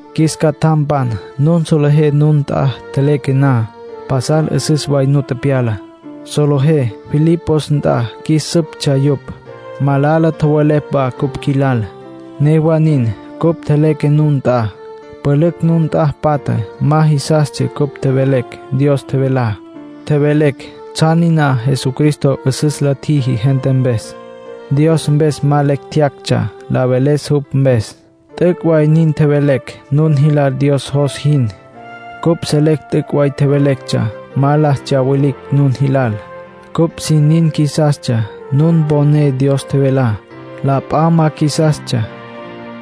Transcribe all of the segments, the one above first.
Qjuis catjampan, nun solejé nun nt'a tjeleque na, pasal 'üsüs way nu tepyala. Solejé Filipos nt'a qjuis süptsja yupj, malala tjowelepj wa cupj qjuilal. Newa nin, cupj tjeleque nun nt'a. Pülücj nun nt'a patja ma jisastsja cupj tjevelecj Dios tjevelá. Tjevelecj tsjan niná Jesucristo 'üsüs la tjiji gente mpes. Dios mpes ma lecj tjeyactsja la veles jupj mpes. T'üc' way nin tjevelecj nun jilal Dios jos jin. Cupj selecj t'üc' way tjevelectsja. Ma la tsyawilicj nun jilal. Cupj sin nin qjuisastsja nun mponé Dios tjevelá. La p'a ma qjuisastsja.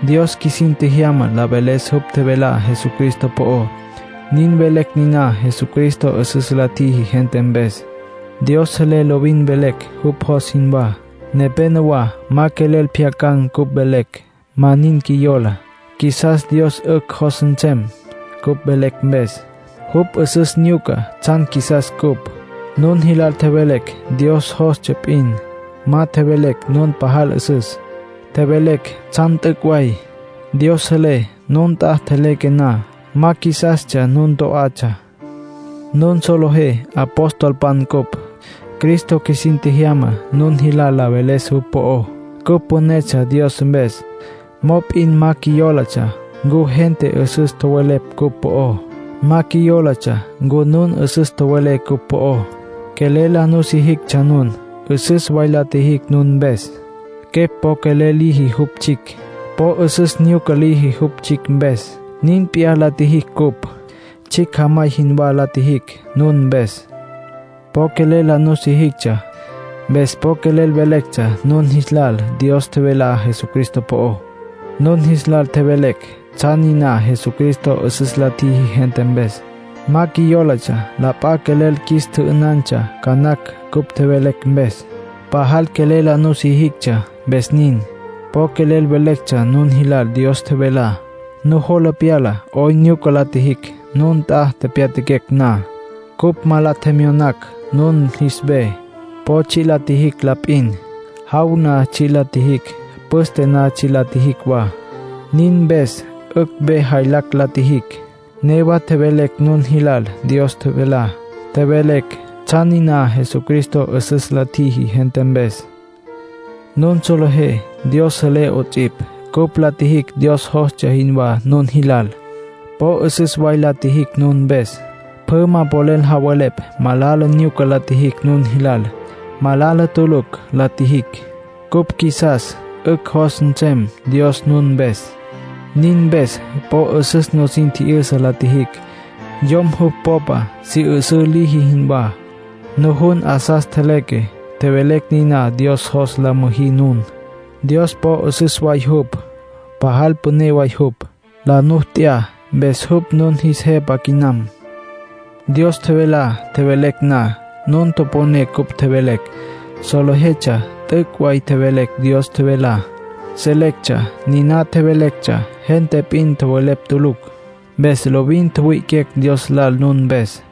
Dios qjuisin tjejyama la veles jupj tjevelá Jesucristo po'ó. Nin velecj niná Jesucristo 'üsüs la tjiji gente mpes. Dios selé lovin velecj jupj jos jinwá. Nepénowa ma quelel pjyacan̈ cupj velecj, ma nin qjuiyola. Qjuisas Dios 'ücj jos nsem cupj velecj mpes. Jupj 'üsüs nyuca tsjan qjuisas cupj. Nun jilal tjevelecj Dios jostsja p'in. Ma tjevelecj nun pajal 'üsüs; tjevelecj tsjan t'üc' way. Dios selé, nun nt'a tjeleque na, ma qjuisastsja nun to'atsja. Nun solejé apostolpan cupj; Cristo qjuisin tjejyama nun jilal la veles jupj po'ó. Cupj pünetsja Dios mpes, mop'in ma qjuiyólatsja ncu gente 'üsüs tjowelepj cupj po'ó. Ma qjuiyólatsja ncu nun 'üsüs tjowelé cupj po'ó. Quelel la nusijictsja nun. 'Üsüs way la tjijicj nun mpes. Quepj po quelel liji jupj tsjicj. Po 'üsüs nyuca liji jupj tsjicj mpes. Nin p'iyá la tjijicj cupj. Tsjicj jamay jinwá la tjijicj nun mpes. Po quelel la nusijictsja. Mpes po quelel velectsja nun jis lal Dios tjevelá Jesucristo po'ó. Nun jis lal tjevelecj tsjan niná Jesucristo 'üsüs la tjiji gente mpes. Ma qjuiyólatsja la p'a quelel qjuis tjü'ünantsja ca nacj cupj tjevelecj mpes. Pajal quelel la nusijictsja, mpes nin. Po quelel velectsja nun jilal Dios tjevelá. Nujola pyala 'oyn nyuca la tjijicj, nun nt'a tepyatjaquecj na. Cupj ma la tjemyonacj nun jis ve. Po tsji' la tjijicj la p'in. Jaw na tsji' la tjijicj. Püste na tsji' la tjijicj wa. Nin mpes 'ücj ve jaylacj la tjijicj. Newa tjevelecj nun jilal Dios tjevelá. Tjevelecj tsjan niná Jesucristo 'üsüs la tjiji gente mpes. Nun solejé, Dios selé 'ots'ipj, cupj la tjijicj Dios jostsja jinwá nun jilal. Po 'üsüs way la tjijicj nun mpes. Pjü ma polel javelepj malala nyuca la tjijicj nun jilal. Malala tulucj la tjijicj. Cupj qjuisas 'ücj jos nsem Dios nun mpes. Nin mpes po 'üsüs nusin tji'yüsa la tjijicj, yom jupj popa si 'üsǘ liji jinwá. Nujun 'asas tjeleque, tjevelecj niná Dios jos la müjí nun. Dios po 'üsüs way jupj. Pajal püné way jupj. La nu t'ya, mpes jupj nun jis Jepa quinam. Dios tjevelá tjevelecj na, nun toponé cupj tjevelecj. Solejetsja t'üc' way tjevelecj Dios tjevelá. Solejetsja niná tjevelectsja gente p'in tjowelepj tulucj. Mpes lovin tjuwi'iquecj Dios lal nun mpes.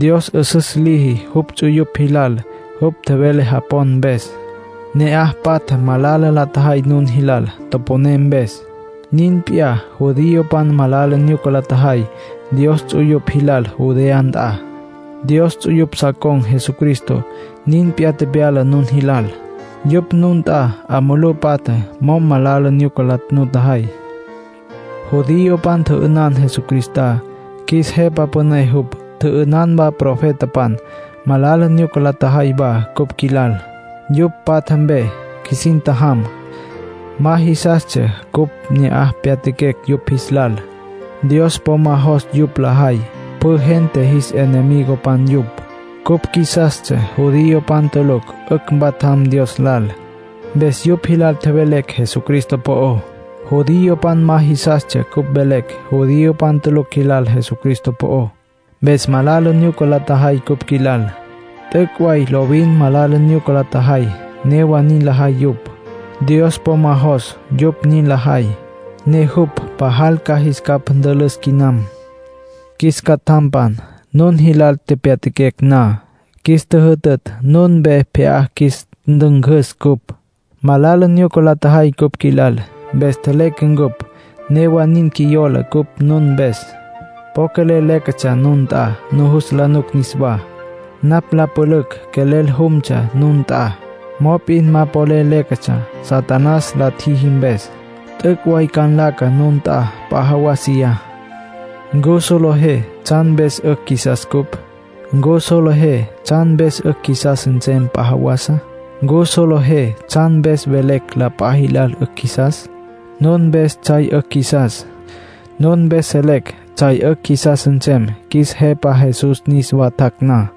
Dios 'üsüs liji jupj ts'uyupj jilal, jupj tjevele japon mpes. Ne'aj patjá malala la tjajay nun jilal, toponé mpes. Nin p'iyá judiopan malala nyuca la tjajay Dios ts'uyupj jilal Judea nt'a. Dios ts'uyupj sa con̈ Jesucristo. Nin p'iyá tepyala nun jilal. Yupj nun nt'a 'a mulú patja mo'm malala nyuca la nutjajay. Judiopan tjü'ünan Jesucristá, qjuis Jepa Püné jupj. Tjü'ünan wa profetapan. Malala nyuca la tjajay wa cupj qjuilal. Yupj patja mpe qjuisin tjajam; ma jisastsja cupj ne'aj tepyatjaquecj yupj jis lal. Dios po ma jos yupj lajay. Pjü gente jis enemigopan yupj. Cupj qjuisastsja judiopan tulucj 'ücj mpatjam Dios lal. Mpes yupj jilal tjevelecj Jesucristo po'ó. Judiopan ma jisastsja cupj mvelecj judiopan tulucj jilal Jesucristo po'ó. Mpes malala nyuca la tjajay cupj qjuilal. T'üc' way lovin malala nyuca la tjajay. Newa nin lajay yupj. Dios po ma jos yupj nin lajay, ne jupj pajal ca jis capj ntülüs quinam. Qjuis catjampan, nun jilal tepyatjaquecj na, qjuis tjüjütütj nun mpe pje'á qjuis ntüncüs cupj. Malala nyuca la tjajay cupj qjuilal. Mpes tjeleque ncupj. Newa nin, qjuiyola cupj nun mpes. Po quelel léquetsja nun nt'a nujus la nuc niswá. Napj la pülücj quelel jumtsja nun nt'a. Mop'in ma polel léquetsja Satanás la tjiji mpes. T'üc' way ca nlaca nun nt'a p'a jawasiyá. ¿Ncu solejé tsjan mpes 'ücj qjuisas cupj? ¿Ncu solejé tsjan mpes 'ücj qjuisas nsem p'a jawasa? ¿Ncu solejé tsjan mpes velecj la p'a jilal 'ücj qjuisas? Nun mpes tsjay 'ücj qjuisas. Nun mpes selecj tsjay 'ücj qjuisas nsem qjuis Jepa Jesús niswa tjac' na.